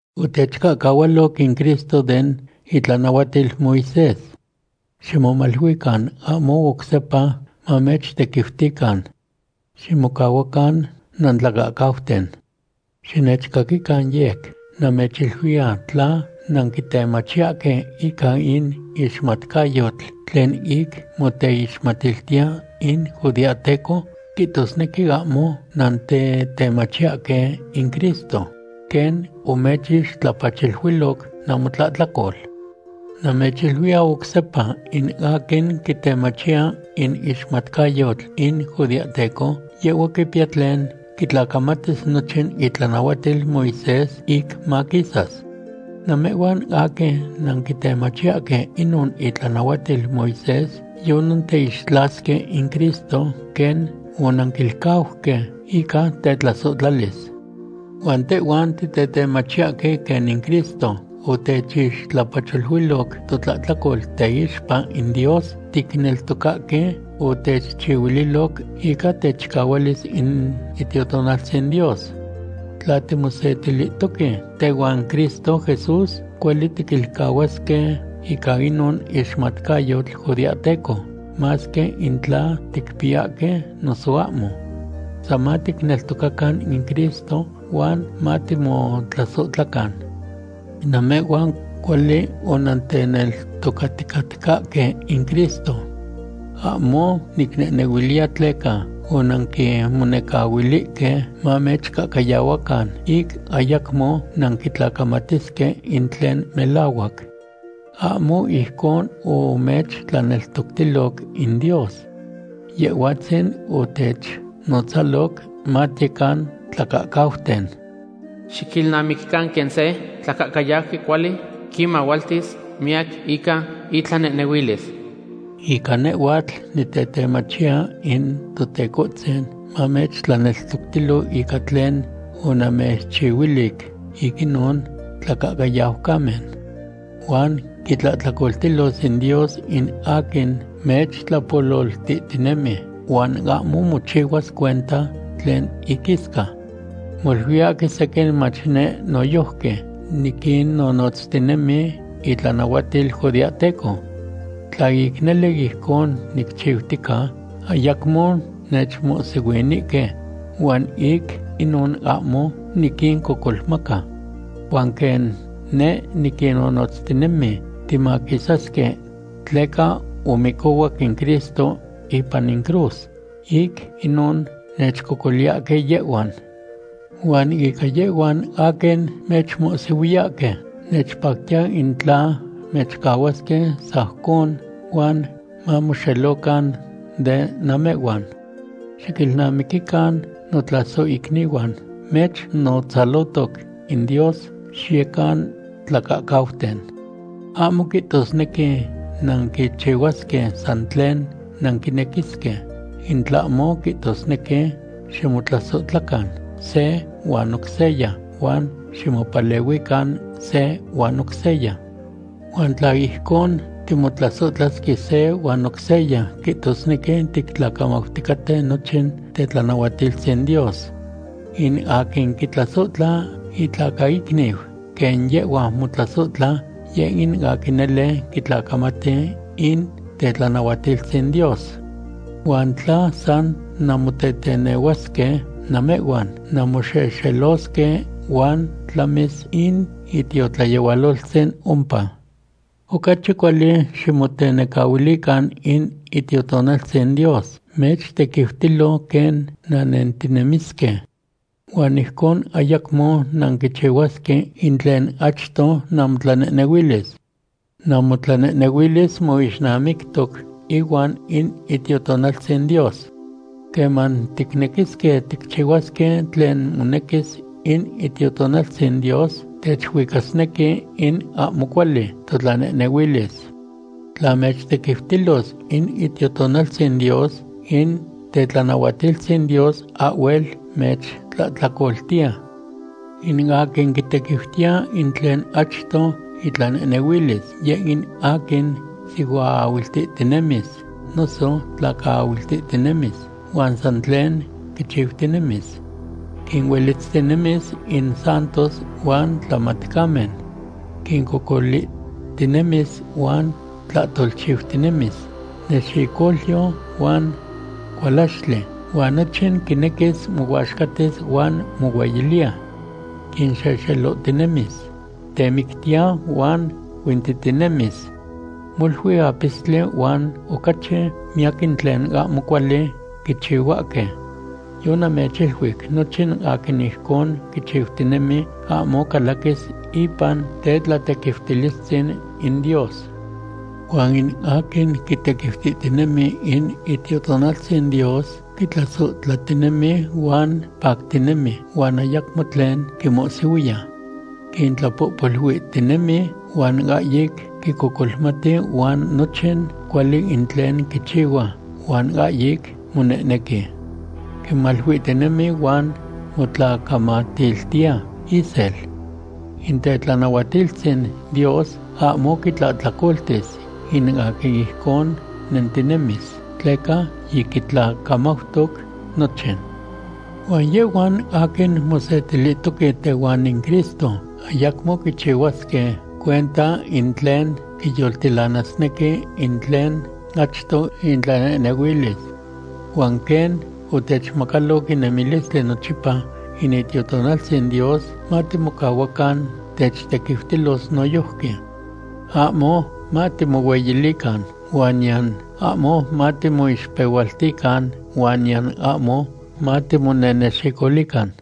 Otechcahcahualoc in Cristo den itlanahuatil Moisés. Ximomaluican ahmo oc sepa mamechtequiutican. Ximocahuacan nantlacahcauten. Xinechcaquican yec. Namechiluiya tla nanquitemachiyahque ica in ixmatcayotl tlen ic moteixmatiltiya in judeahteco, quihtosnequi ahmo nantetemachiyahque in Cristo, quen omechixtlapacholuiloc namotlahtlacol. Namechiluiya oc sepa, in aquin quitemachiya in ixmatcayotl in judeahteco, yehhua quipiya tlen quitlacamatis nochin itlanahuatil Moisés ic maquisas. Namehhuan aquin nanquitemachiyahque inon itlanahuatil Moisés yonanteixtlasque in Cristo quen onanquilcauque ica tetlasohtlalis. Huan tehhuan titetemachiyahque quen in Cristo otechixtlapacholuiloc totlahtlacol teixpa in Dios, ticneltocahque otechchihuililoc ica techicahualis in Itiotonaltzin Dios. Tla timosetilihtoque tehuan Cristo Jesús, cuali tiquilcahuasque ica inon ixmatcayotl judeahteco, masque in tla ticpiyahque noso ahmo. San matiteneltocacan in Cristo huan matimotlasohtlacan. Namehhuan cuali onanteneltocaticatcahque in Cristo. Ahmo nicnehnehuiliya tleca onanquinmonecahuilihque mamechcahcayahuacan ic ayacmo nanquitlacamatisque in tlen melahuac. Ahmo ijcon omechtlaneltoctiloc in Dios. Yehhuatzin otechnotzaloc matiyecan tlacahcauten. Xiquilnamiquican quen se tlacahcayauqui cuali quinmahualtis miyac ica itlanehnehuilis. Ica nehhuatl, nitetemachiya in Totecohtzin mamechtlaneltoctilo ica tlen onamechiluic ic inon tlacahcayaucamen. Huan quitlahtlacoltilos in Dios in aquin mechtlapololtihtinemi, huan ahmo mochihuas cuenta tlen iquisca. Moluiyahque sequin mach neh noyojqui niquinnonotztinemi itlanahuatil judeahteco. Tla ic nele ijcon nicchiutica, ayacmo nechmohsihuinihque, huan ic inon ahmo niquincocolmaca. Huan quen neh niquinnonotztinemi timaquisasque tleca omicohuac in Cristo ipan in cruz, ic inon nechcocoliyahque yehhuan. Huan ica yehhuan aquin mechmohsihuiyahque, nechpactiya in tla mechcahuasque sajcon huan mamoxelocan de namehhuan. Xiquilnamiquican notlasohicnihuan, mechnotzalohtoc in Dios xiyecan tlacahcauten. Ahmo quihtosnequi nanquichihuasque san tlen nanquinequisque, in tlahmo quihtosnequi ximotlasohtlacan se huan oc seya huan ximopalehuican se huan oc seya. In tla ijcon timotlasohtlasque se huan oc seya, quihtosnequi tictlacamauticaten nochin tetlanahuatiltzin Dios. In aquin quitlasohtla itlacaicniu quen yehhua motlasohtla, yeh in aquin nele quitlacamati in tetlanahuatiltzin Dios. Huan tla san namotetenehuasque, namehhuan nanmoxexelosque huan tlamis in itiotlayehualoltzin ompa. Ocachi cuali ximotenecahuilican in Itiotonaltzin Dios mechtequiutilo quen nannentinemisque. Huan ijcon ayacmo nanquichihuasque in tlen achto namotlanehnehuilis. Namotlanehnehuilis moixnamictoc ihuan in Itiotonaltzin Dios. Queman ticnequisque ticchihuasque tlen monequis in Itiotonaltzin Dios, techuicasnequi in ahmo cuali totlanehnehuilis. Tla mechtequiutilos in Itiotonaltzin Dios, in tetlanahuatiltzin Dios ahhuel mechtlahtlacoltiya. In aquin quitequiutiya in tlen achto itlanehnehuilis, yeh in aquin sihuaahuiltihtinemis noso tlacaahuiltihtinemis huan san tlen quichiutinemis. Quinuelitztinemis in santos huan tlamatcamen. Quincocolihtinemis huan tlahtolchiutinemis. Nexicolyo huan cualaxtli, huan nochin quinequi mohuaxcatis huan mohueyiliya. Quinxexelohtinemis. Temictiya huan huintihtinemis. Molui apistli huan ocachi miyac in tlen ahmo cuali quichihuahque. Yonamechiluic nochin aquin ijcon quichiutinemi ahmo calaquis ipan tetlatequiutilistzin in Dios. Huan in aquin quitequiutihtinemi in Itiotonaltzin Dios quitlasohtlatinemi huan pactinemi huan ayacmo tlen quimohsihuiya. Quintlapohpoluihtinemi huan ahyic quicocolmati huan nochin cuali in tlen quichihua huan ahyic monehnequi. Quimaluihtinemi huan motlacamatiltiya isel. In tetlanahuatiltzin Dios ahmo quitlahtlacoltis in aquin ijcon nentinemis tleca yiquitlacamautoc nochin. Huan yehhuan aquin mosetilihtoque tehuan in Cristo ayacmo quichihuasque cuenta in tlen quinyoltilanasnequi in tlen achto intlanehnehuilis. Huan quen otechmacaloc in nemilistli nochipa in Itiotonaltzin Dios, matimocahuacan techtequiutilos noyojqui. Ahmo matimohueyilican, huan niyan ahmo matimoixpehualtican huan niyan ahmo matimonenexicolican.